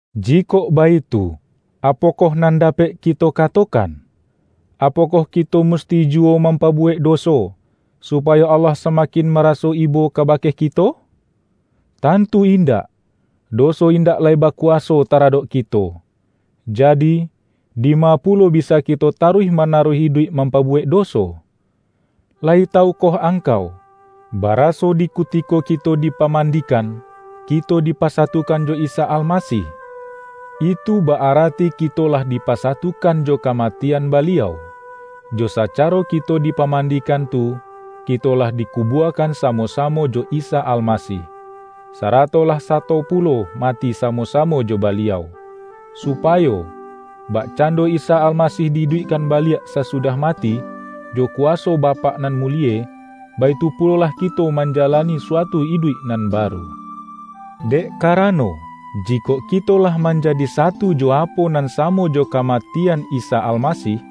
Jikok baitu, apokoh nan dapek kito katokan? Apokoh kito musti juwo mampabuwek doso, supayo Allah samakin maraso ibo kabake kito? Tantu indak! Doso indak lai bakuwaso taradok kito, jadi, dima pulo bisa kito taruih manaruih iduik mampabuwek doso? Layi tawukoh angkau, baraso di kutiko kito dipamandikan, kito dipasatukan jo Isa Almasih? Itu ba-arati kito lah dipasatukan jo kamatian Baliau. Jo sacaro kito dipamandikan tu, kito lah dikubuakan samo-samo jo Isa Almasih, sarato lah sato pulo mati samo-samo jo Baliau, supayo, bakcando Isa Almasih di-iduikkan baliak sasudah mati, jo kuwaso Bapak nan mulie, baitu pulolah kito manjalani suatu iduik nan baru. Dek karano, jikok kito lah manjadi satu jo apo nan samo jo kamatian Isa Almasih,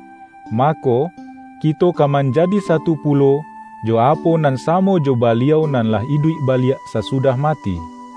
mako, kito ka manjadi satu pulo, jo apo nan samo jo Baliau nan lah iduik baliak sasudah mati.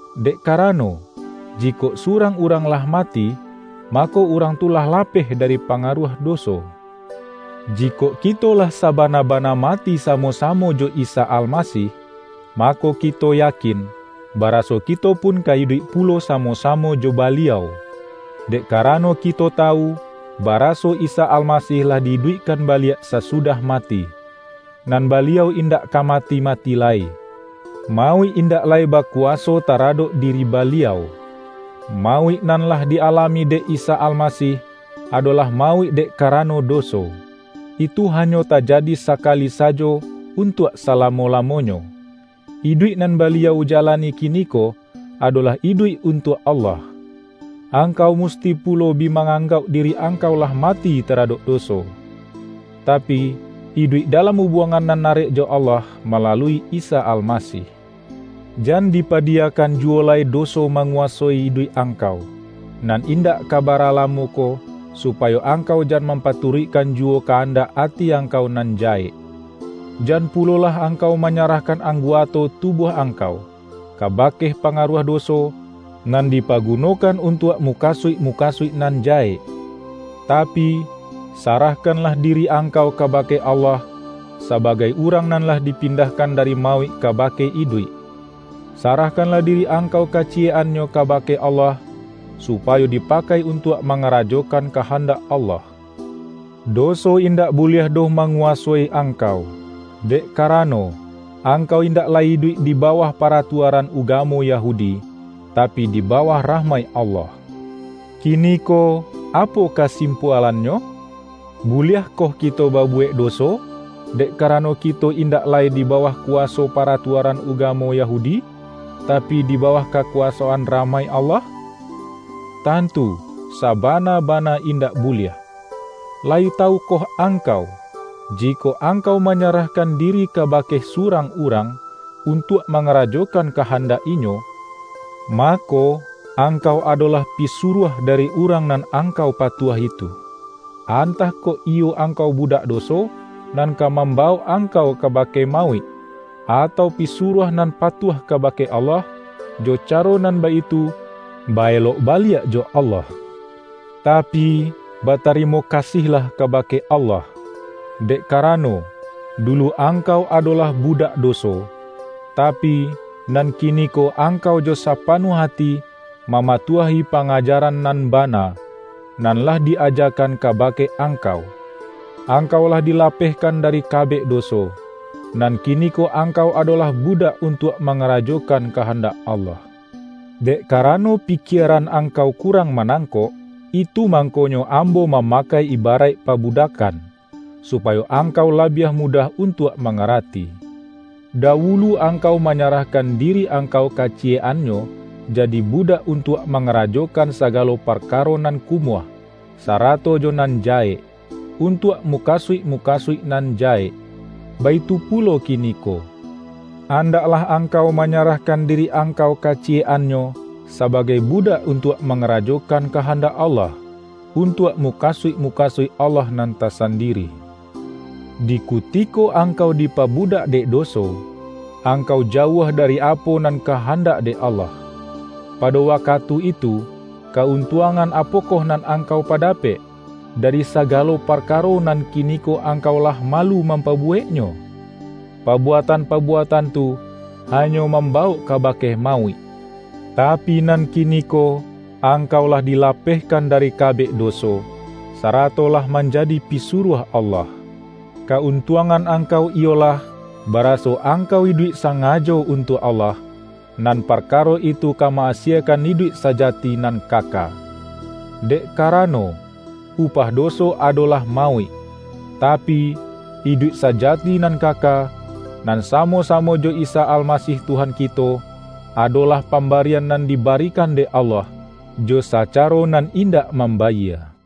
Dek karano, jikok surang urang lah mati, mako, urang tu lah lapeh dari pangaruah doso. Jikok kito lah sabana-bana mati samo-samo jo Isa Almasih, mako kito yakin, baraso kito pun ka iduik pulo samo-samo jo Baliau. Dek karano kito tawu, baraso Isa Almasih lah di-iduikkan baliak sasudah mati, nan Baliau indak ka mati-mati lai; mauik indak lai bakuwaso taradok diri Baliau. Mauik nan lah di-alami dek Isa Almasih, adolah mauik dek karano doso. Itu hanyo tajadi sakali sajo untuak salamo-lamonyo. Iduik nan Baliau jalani kiniko, adolah iduik untuak Allah. Angkau musti pulo bi ma-anggauk diri angkau lah mati taradok doso, tapi, iduik dalam ubuangan nan arek jo Allah malalui Isa Almasih. Jan dipadiyakan juwo lai doso manguwasoi iduik angkau, nan indak ka bara lamo ko, supayo angkau jan mampaturuikkan juwo kandak ati angkau nan jahek. Jan pulolah angkau manyarahkan angguato tubuah angkau, kabake pangaruah doso, nan dipagunokan untuak mukasuik-mukasuik nan jahek. Tapi, sarahkanlah diri angkau kabake Allah, sabagai urang nan lah dipindahkan dari mauik kabake iduik. Sarahkanlah diri angkau kaciyek-annyo kabake Allah, supayo dipakai untuak mangarajokan kahandak Allah. Doso indak buliah doh manguwasoi angkau, dek karano, angkau indak lai iduik di bawah paratuaran ugamo Yahudi, tapi, di bawah rahmaik Allah. Kiniko, apo kasimpualannyo? Buliahkoh kito babuwek doso, dek karano kito indak lai di bawah kuwaso paratuaran ugamo Yahudi, tapi, di bawah kakuwasoan rahmaik Allah? Tantu, sabana-bana indak buliah! Layi tawukoh angkau, jikok angkau manyarahkan diri kabake surang urang, untuak mangarajokan kahandak inyo, mako, angkau adolah pisuruah dari urang nan angkau patuahi tu-antah kok iyo angkau budak doso, nan ka mambawok angkau kabake mauik, atau pisuruah nan patuah kabake Allah, jo caro nan baitu, ba-elok baliak jo Allah. Tapi, batarimo kasihlah kabake Allah! Dek karano, dulu angkau adolah budak doso, tapi, nan kiniko angkau jo sapanuah ati, mamatuahi pangajaran nan bana, nan lah di-ajakan kabake angkau. Angkau lah dilapehkan dari kabek doso, nan kiniko angkau adolah budak untuak mangarajokan kahandak Allah. Dek karano pikieran angkau kurang manangkok, itu mangkonyo ambo mamakai ibaraik pabudakkan, supayo angkau labiah mudah untuak mangarati. Dawulu angkau manyarah-kan diri angkau kaciyek-annyo, jadi budak untuak mangarajokan sagalo parkaro nan kumuah, sarato jo nan jahek, untuak mukasuik-mukasuik nan jahek. Baitu pulo kiniko, andaklah angkau manyarahkan diri angkau kaciyek-annyo, sabagai budak untuak mangarajokan kahandak Allah, untuak mukasuik-mukasuik Allah nan tasandiri. Di kutiko angkau dipabudak dek doso, angkau jauah dari apo nan kahandak dek Allah. Pado wakatu itu, ka-untuangan apokoh nan angkau padapek, dari sagalo parkaro nan kiniko angkau lah malu mampabuweknyo? Pabuatan-pabuatan tu, hanyo mambawok kabake mauik! Tapi nan kiniko, angkau lah dilapehkan dari kabek doso, sarato lah manjadi pisuruah Allah. Ka-untuangan angkau iyolah, baraso angkau iduik sangajo untuak Allah, nan parkaro itu ka ma-asiekan iduik sajati nan kaka. Dek karano, upah doso adolah mauik; tapi, iduik sajati nan kaka, nan samo-samo jo Isa Almasih Tuhan kito, adolah pambarian nan dibarikan dek Allah, jo sacaro nan indak mambayie. ROMA